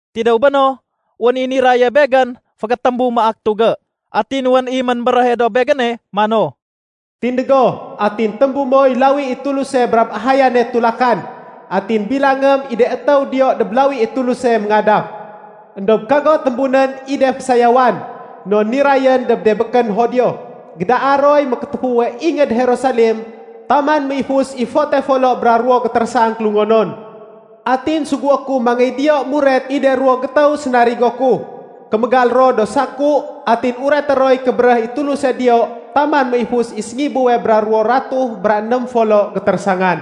Tidéw béno, wén i niraye begén fégétémbu maak tugé. Atin wén i ménbéréhe dob begéne mano, “Tindég go atin témbu moy lawi i Tuluse brab ahayane tulakan. Atin bilangém i de étéw diyo dob lawi i Tuluse méngadaf. Endob kago témbunén i de fésayawan non nirayén dob de békén Judio. Gédaa roy mékétéfuwe ingéd Jerusalem taman méifus i fote folo bra ruwo gétérésang kélungonon. Atin sugué ku mangéy diyo muret i de ruwo gétéw sénarigo ku. Kémégal ro do saku atin ureté roy kébéréh i Tuluse diyo taman méifus i séngibuwe bra ruwo ratuh bra ném folo gétérésangan.”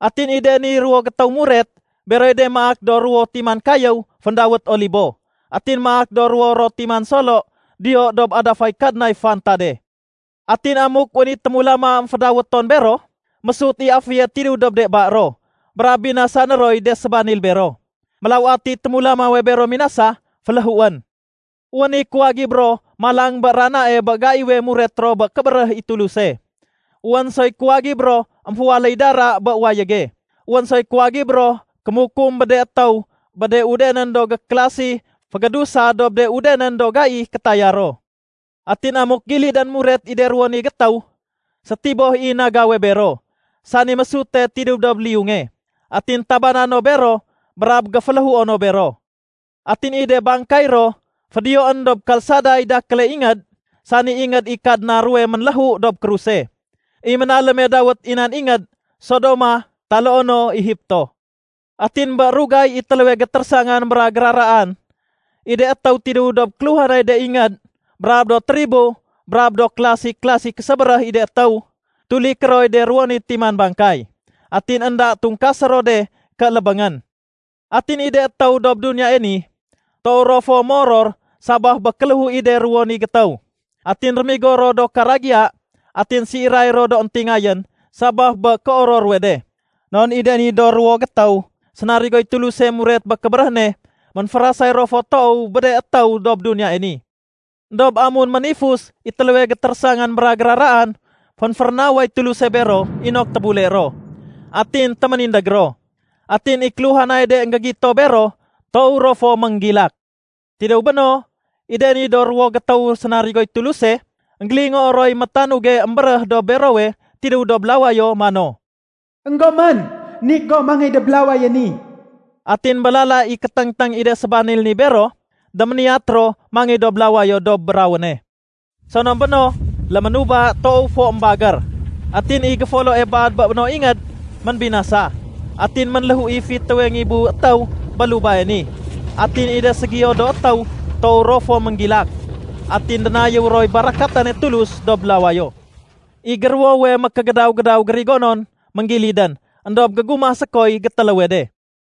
Atin i de ni ruwo gétéw muret, beroy de maak do ruwo timan kayéw féndawét Olibo, atin maak do ruwo ro timan solo diyo dob adafay Kadnay fantade. Atin amuk wén i témulama émfédawéton bero, mésut i aféye tidéw dob de ba ro brab binasané roy de sébanil bero. Mélaw atiy témulamawe bero minasa, féléhuén. Wén i kuwagib ro malang bé ranae bé gaiwe muret ro bé kébéréh i Tuluse. Wén soy kuwagib ro émféwaléy dara bé wayége. Wén soy kuwagib ro kémukum bé de étéw bé de udenén do gékélasi fégédusa dob de udenén do gai kétaya ro. Atin amuk gilidén muret i de ruwo ni gétéw, sétiboh i nagawe bero, sani mésute tidéw dob liyunge. Atin tabana no bero brab géféléhuo no bero. Atin i de bangkay ro fédiyoén dob kalsaday dakéle ingéd, sani ingéd i Kadna ruwe ménléhu dob kruse. I ménaléme dawét i nan ingéd “Sodoma” taloo no “Egipto”. Atin bé rugay i téléwe gétérésangan bra géraraan, i de étéw tidéw dob kéluhanay de ingéd brab do tribo brab do kélasi-kélasi késébéréh i de étéw, tuliké roy de ruwo ni timan bangkay, atin énda tungkasé ro de ké lébéngén. Atin i de étéw dob duniyae ni, toow ro fo moror sabaf bé kéléhu i de ruwo ni gétéw. Atin rémigo ro do karagiya atin séiray ro do éntingayén sabaf bé kéoror ruwe de. Non i de ni do ruwo gétéw sénarigoy Tuluse muret bé kébéréh ne ménférasay ro fo toow bé de étéw dob duniyae ni. Endob amun ménifus i téléwe gétérésangan bra géraraan, fénférénaway Tuluse bero inok tébule ro. Atin téménindég ro. Atin i kéluhanay de énggégito bero, toow ro fo ménggilak. Tidéw béno, i de ni do ruwo gétéw sénarigoy Tuluse, énggélingoo roy métanuge émbéréh dob berowe tidéw dob lawayo mano, “Enggomén, nik gom mangéy dob lawaye ni.” Atin bé lala i kéténgténg i de sébanil ni bero, déméniyat ro mangéy dob lawayo dob rawéne. Sonom béno, léménuba toow fo émbagér. Atin i géfoloe baad bé no ingéd ménbinasa. Atin ménléhu i fitéwe ngibu étéw bé lubae ni. Atin i de ségiyo do étéw toow ro fo ménggilak, atin dénayéw roy barakatane Tulus dob lawayo. I géruwowe mékégédaw-gédaw gérigonon ménggilidén. Endob gégumah sékoy gétéléwe de.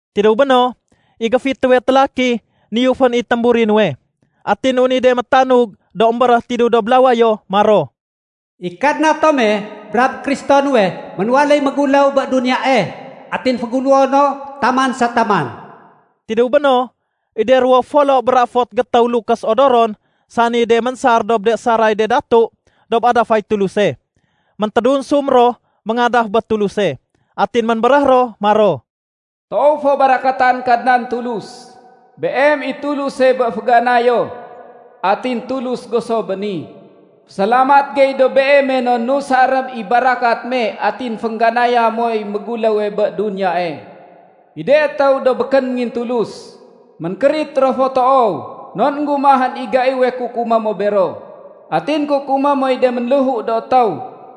Tidéw béno, i géfitéwe télaki niyufén i témburi nuwe. Atin wén i de métanug do émbéréh tidéw dob lawayo maro, “I Kadna tome brab Kristo nuwe ménwaléy méguléw bé duniyae. Atin féguléwo no taman sa taman.” Tidéw béno, i de ruwo folo bra fot gétéw lukés odoron sani de ménsar dob de saray de datu dob adafay Tuluse, méntédunsum ro méngadaf bé Tuluse. Atin ménbéréh ro maro, “Toow fo barakatan Kadnan Tulus, Beem i Tuluse bé féganayo atin Tulus go so béni. Fésalamat gey dob Beeme non nusarém i barakat me atin féngganaya moy méguléwe bé duniyae. I de étéw do békén méngintulus, ménkérit ro toow non énggumahén i gaiwe kukumé mo bero. Atin kukumé moy de ménléhu do étéw.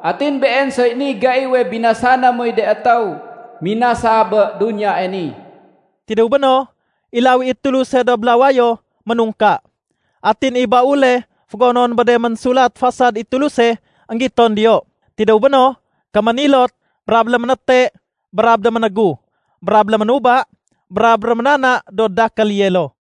Atin been soy niy gaiwe binasané moy de étéw minasa bé duniyae ni.” Tidéw béno, i lawi i Tuluse dob lawayo, ménungka. Atin i baule fégonon bé de ménsulat fasad i Tuluse énggiton diyo. Tidéw béno, kéménilot brab léménéte brab déménégu brab léménuba brab réménana do dakél yelo.